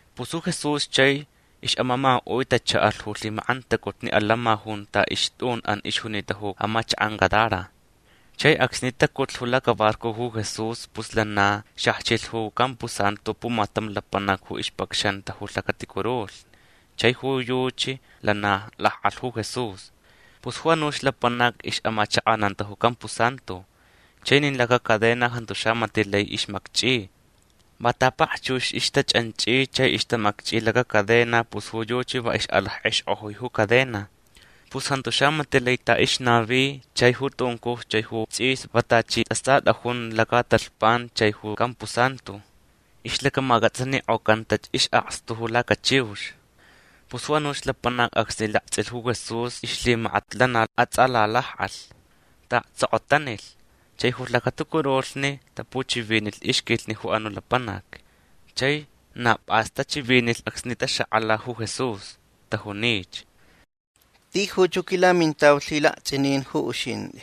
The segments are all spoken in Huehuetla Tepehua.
Pus ju Jesús chai ixʼamamakaʼui tachaʼalh ju lhimakʼantacutni atantsʼin junta ixtʼunʼan ixjunita ju amachakʼan Gadara. Chai acsni tacutlh ju lacabarco ju Jesús pus lana xajchilh ju campusantu pumatam lapanac ju ixpacxanta ju lhacaticurulhni. Chai ju yuchi lana lakʼalh ju Jesús. Pus ju anuch lapanac ixʼamachakʼananta ju campusantu. Chai nin lacacadena jantu xamatiʼ lai ixmakchʼi. Va ta pakchux ixtachʼanchʼi chai ixtamakchʼi lacacadena pus ju yuchi va ixʼalackʼexkʼojui ju cadena. Pus jantu xamatiʼ lai ta ixnavi. Chai ju tuncuj chai ju tsʼis va tachi istʼasatʼajun lacatalhpan chai ju campusantu. Ixlacamacʼatsanikʼocantach isʼakstu ju lacachiux. Pus ju anuch lapanac acsni laktsʼilh ju Jesús ixlhimakat lana atsʼalalakʼalh. Taʼaktsokotanilh. Chai ju lhacaticurulhni tapuchivinilh ixquilhni ju anuʼ lapanac. Chai na pʼas ju tachivinilh acsni taxakʼala ju Jesús. Tajunich: ―Tijuch ju quilamintau lhilaktsʼinin ju uxintʼi.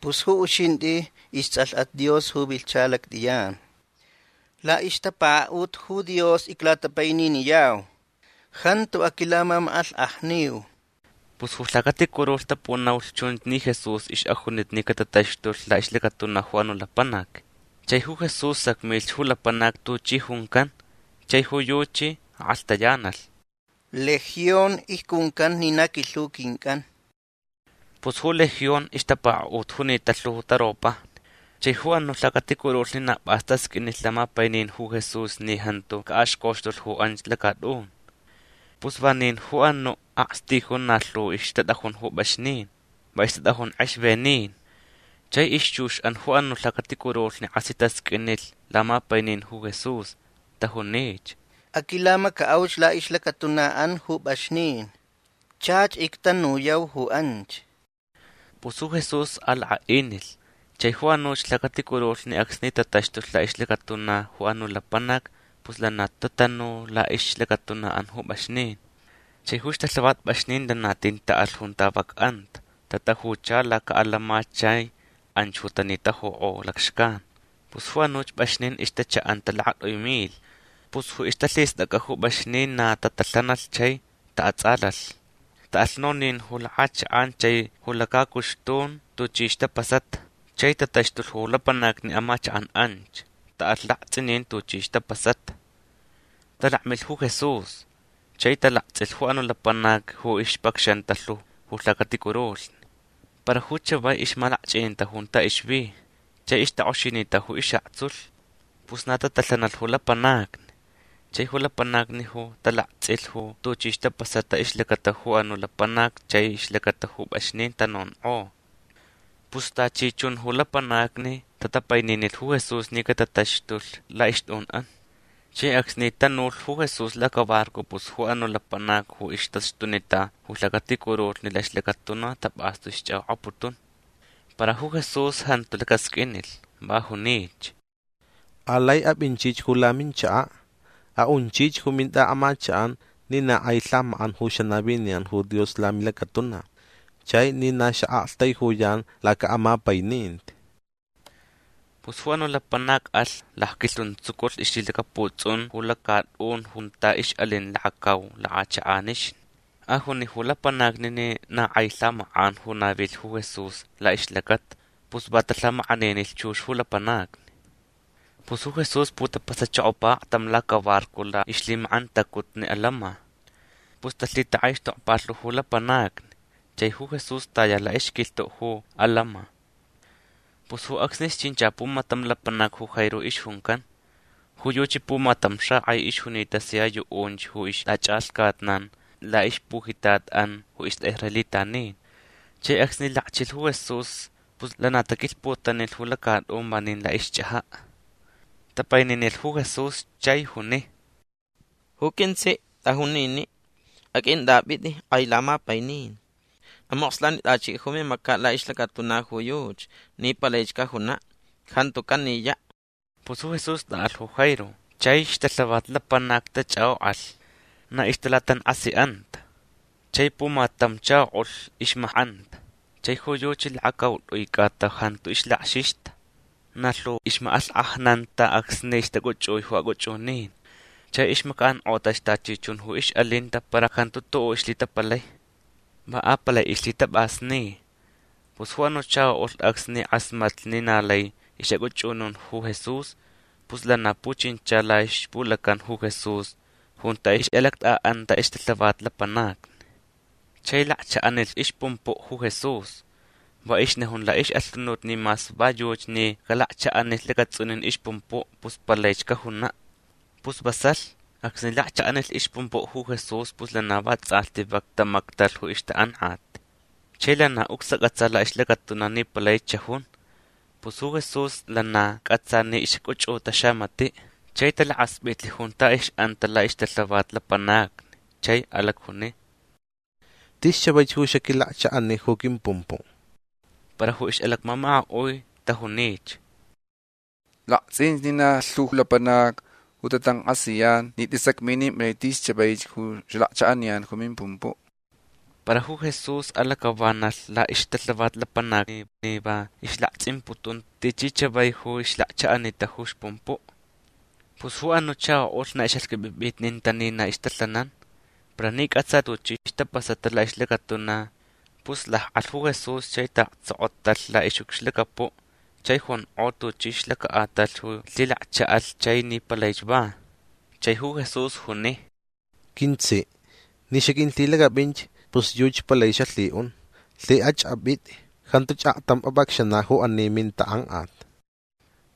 Pus ju uxintʼi istsʼalhʼat Dios ju vilhcha lactʼiyan. Laʼixtapakaʼut ju Dios iclatapaininiyau. Jantu aquilamamakʼalhkʼajniu. Pus ju lhacaticurulhni tapunaulh chunch ni Jesús ixʼajunita ni catataxtulh laʼixlacatuna ju anuʼ lapanac. Chai ju Jesús sacmilh ju lapanac tuchi juncan. Chai ju yuchi akʼalhtayanalh: ―Legión icjuncan ni na quilhu quincʼan. Pus ju Legión ixtapakaʼut junita lhu taropajni. Chai ju anuʼ lhacaticurulhni na pʼas tasqʼuinilh lamapainin ju Jesús ni jantu caʼaxcoxtulh ju anch lacatʼun. Pus vanin ju anuʼ akstijun na lhu ixtatʼajun ju pʼaxnin. Va ixtatʼajun kʼexvenin. Chai ixchuxʼan ju anuʼ lhacaticurulhni kʼasi tasqʼuinilh lamapainin ju Jesús. Tajunich: ―Aquilamacaʼauch laʼixlacatunaʼan ju pʼaxnin. Chach ictanuyau ju anch. Pus ju Jesús alakʼaʼinilh. Chai ju anuch lhacaticurulhni acsni tataxtulh laʼixlacatuna ju anuʼ lapanac pus lana tatanu laʼixlacatunaʼan ju pʼaxnin. Chai ju ixtalhavat pʼaxnin lana tin taʼalh junta vak anta. Tatajucha lacaʼatantsʼin chai anch ju tanitajukʼo lacxcan. Pus ju anuch pʼaxnin ixtachaʼanta lakatʼui milh. Pus ju ixtalhistʼacʼa ju pʼaxnin na tatalhanalh chai taʼatsʼalalh. Taʼalh nonin ju lakʼachakʼan chai ju lacacuxtun tuchi ixtapasata. Chai tataxtulh ju lapanacni amachakʼan anch. Taʼalh laktsʼinin tuchi ixtapasata. Talakmilh ju Jesús. Chai talaktsʼilh ju anuʼ lapanac ju ixpacxanta lhu ju lhacaticurulhni. Para ju chavai ixmalakchʼininta junta ixvi. Chai ixtakʼoxinita ju isʼaktsulh. Pus na tatalhanalh ju lapanacni. Chai ju lapanacni ju talaktsʼilh ju tuchi ixtapasata ixlacata ju anuʼ lapanac chai ixlacata ju pʼaxnin tanonkʼo. Pus tachi chun ju lapanacni tatapaininilh ju Jesús ni cataxtulh laʼixtʼunʼan. Chai acsni tanulh ju Jesús lacabarco pus ju anuʼ lapanac ju ixtaxtunita ju lhacaticurulhni laʼixlacatuna tapʼastu ixchʼakʼokʼaputun. Para ju Jesús jantu lacasqʼuinilh. Va junich: ―Alai apʼinchich ju laminchakaʼ. Aʼunchich ju mintʼaʼamachakʼan ni na kʼai lhamakʼan ju xanaviniyan ju Dios lamilacatuna chai ni na xaʼaktaijuyan lacaʼamapaininti. Pus ju anuʼ lapanac alh. Lacquilhuntsuculh ixlhilacaputsʼun ju lacatʼun junta ixʼalin lakacau lakʼachakʼanixni. Ajuni ju lapanacni ni na kʼai lhamakʼan ju navilh ju Jesús laʼixlacata. Pus va talhamakʼaninilh chux ju lapanacni. Pus ju Jesús putapasachokopa aktam lacabarco laʼixlhimakʼantacutni ju atantsʼin. Pus talhitakʼaixtokpa lhu ju lapanacni. Chai ju Jesús taya laʼixquilhtuʼ ju atantsʼin. Pus ju acsnich chincha pumatam lapanac ju Jairo ixjuncan. Ju yuchi pumatam xakʼai ixjunita sia yuʼunch ju ixtachʼalhcatnan laʼixpujitatʼan ju istʼaʼisraelitanin. Chai acsni lakchilh ju Jesús pus lana taquilhputanilh ju lacatʼun vanin laʼixchʼajaʼ. Tapaininilh ju Jesús chai juni: ―Ju quintsiʼ tʼajun niniʼ. Aqʼuintʼapʼitʼi kʼai lamapainin. Amokslanitʼachiʼ ju mimacaʼ laʼixlacatuna ju yuchi ni palaich cajunaʼ. Jantu caniyaʼ. Pus ju Jesús tʼaʼalh ju Jairo. Chai ixtalhavat lapanacni tachʼakʼokʼalh. Na ixtalatankʼasiʼanta. Chai pumatam chakoʼulh ixmakʼanta. Chai ju yuchi lakacautʼui cʼata jantu ixlakxixta. Na lhu ixmakʼalhkʼajnanta acsni ixtacʼuchʼui ju acʼuchʼunin. Chai ixmacaʼankʼotach tachi chun ju ixʼalinta para jantu tuʼuʼ ixlhitapalai. Va apalai ixlhitapʼasni. Pus ju anuʼ chakoʼulh acsni kʼasmatlh ni na lai ixʼacʼuchʼunun ju Jesús pus lana puchincha laʼixpulacan ju Jesús junta ixʼalactʼaʼanta ixtalhavat lapanacni. Chai lakchaʼanilh ixpumpuʼ ju Jesús. Va ixnajun laʼixʼalhunut ni mas va yuchi ni calakchaʼanilh lacatsʼunin ixpumpuʼ pus palaich cajunaʼ. Pus vasalh. Acsni lakchaʼanilh ixpumpuʼ ju Jesús pus lana vatsʼalhti vak tamactalh ju ixtakʼankʼat. Chai lana ucsacʼatsa laʼixlacatuna ni palaich xajun. Pus ju Jesús lana cʼatsa ni ixcʼuchʼuta xamatiʼ. Chai talakaspʼitlh junta ixʼanta laʼixtalhavat lapanacni chai alacjuni: ―Tis chavaich ju xaquilakchaʼani ju quimpumpuʼ. Para ju ixʼalacmamakaʼui tajunich: ―Laktsʼinch ni na lhu lapanacni ju tatankʼasiyan ni tʼisacminimpʼalai tis chavaich ju xalakchaʼaniyan ju mimpumpuʼ. Para ju Jesús alacʼavanalh laʼixtalhavat lapanacni ni va ixlaktsʼimputun tichi chavaich ju ixlakchaʼanita ju ixpumpuʼ. Pus ju anuʼ chakoʼulh na ixʼaxqʼuipʼipʼitninta ni na ixtalhananta. Para ni cʼatsa tuchi ixtapasata laʼixlacatuna pus lakʼalh ju Jesús chai taʼaktsokotalh laʼixʼucxlacapuʼ chai jonkʼo tuchi ixlacaʼatalh ju lhilakchaʼalh chai ni palaich va. Chai ju Jesús juni: ―Quintsiʼ ni xaqʼuilhilacʼapʼinch pus yuchi palai xalhiʼun. Lhikʼach apʼitʼi. Jantuch aktam apʼacxanaʼ ju ani mintakʼankʼat.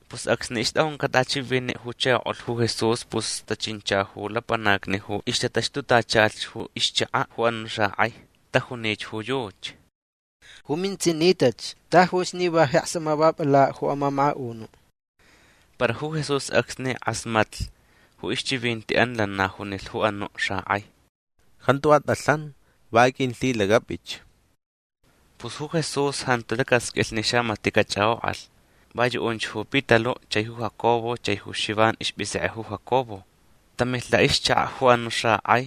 Pus acsni ixtʼajuncaʼ tʼachiviniʼ ju chakoʼulh ju Jesús pus tachincha ju lapanacni ju ixtataxtutachalh ju ixchakaʼ ju anuʼ xakʼai. Tajunich ju yuchi: ―Ju mintsiʼ nitach. Tajuch ni va jeks amavapʼalaʼ ju amamakaʼunuʼ. Para ju Jesús acsni kʼasmatlh ju ixchivintiʼan lana junilh ju anuʼ xakʼai: ―Jantu atʼalhan. Va aqʼuilhilacʼapʼich. Pus ju Jesús jantu lacasqʼuilh ni xamatiʼ cachʼakʼokʼalh. Va yuʼunch ju Pitaluʼ chai ju Jacobo chai ju Xivan ispʼisekʼe ju Jacobo. Tamilh laʼixchakaʼ ju anuʼ xakʼai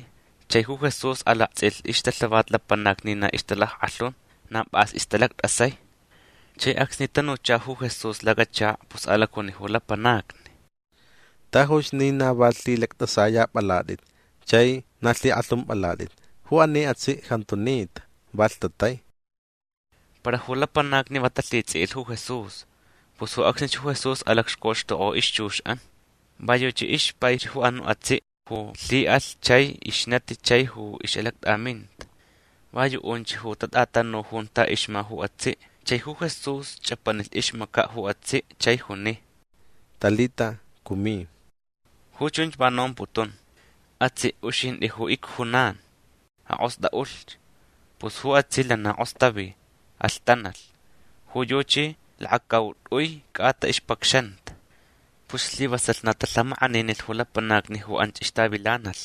chai ju Jesús alaktsʼilh ixtalhavat lapanacni ni na ixtalackʼalhun. Na pʼas ixtalactʼasai. Chai acsni tanucha ju Jesús lacachakaʼ pus alacjuni ju lapanacni: ―Tajuch ni na va lhilactʼasayapʼalatʼit chai na lhikʼalhumpʼalatʼit. Ju ani atsiʼ jantu nita. Va lhtatai. Para ju lapanacni va talhitsʼiʼilh ju Jesús. Pus ju acsnich ju Jesús alacxcoxtokʼo ixchuxʼan. Va yuchi ixpaich ju anuʼ atsiʼ ju lhiʼalh chai ixnatich chai ju ixʼalactʼaminta. Va yuʼunch ju tatʼatanu junta ixma ju atsiʼ. Chai ju Jesús chʼapanilh ixmacaʼ ju atsiʼ chai juni: ―Talita, cumi. Ju chunch va nomputun: Atsiʼ uxintʼi ju icjunan. Akʼostʼaʼulhch. Pus ju atsiʼ lana kʼostavi. Alhtanalh. Ju yuchi lakacautʼui cʼata ixpacxanta. Pus slivasalh na talhamakʼaninilh ju lapanacni ju anch ixtavilanalh.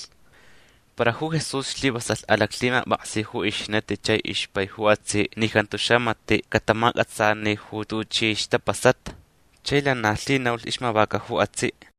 Para ju Jesús slivasalh alaclhimapʼaksi ju ixnati chai ixpai ju atsiʼ ni jantu xamatiʼ catamacʼatsani ju tuchi ixtapasata. Chai lana lhinaulh ixmavaca ju atsiʼ.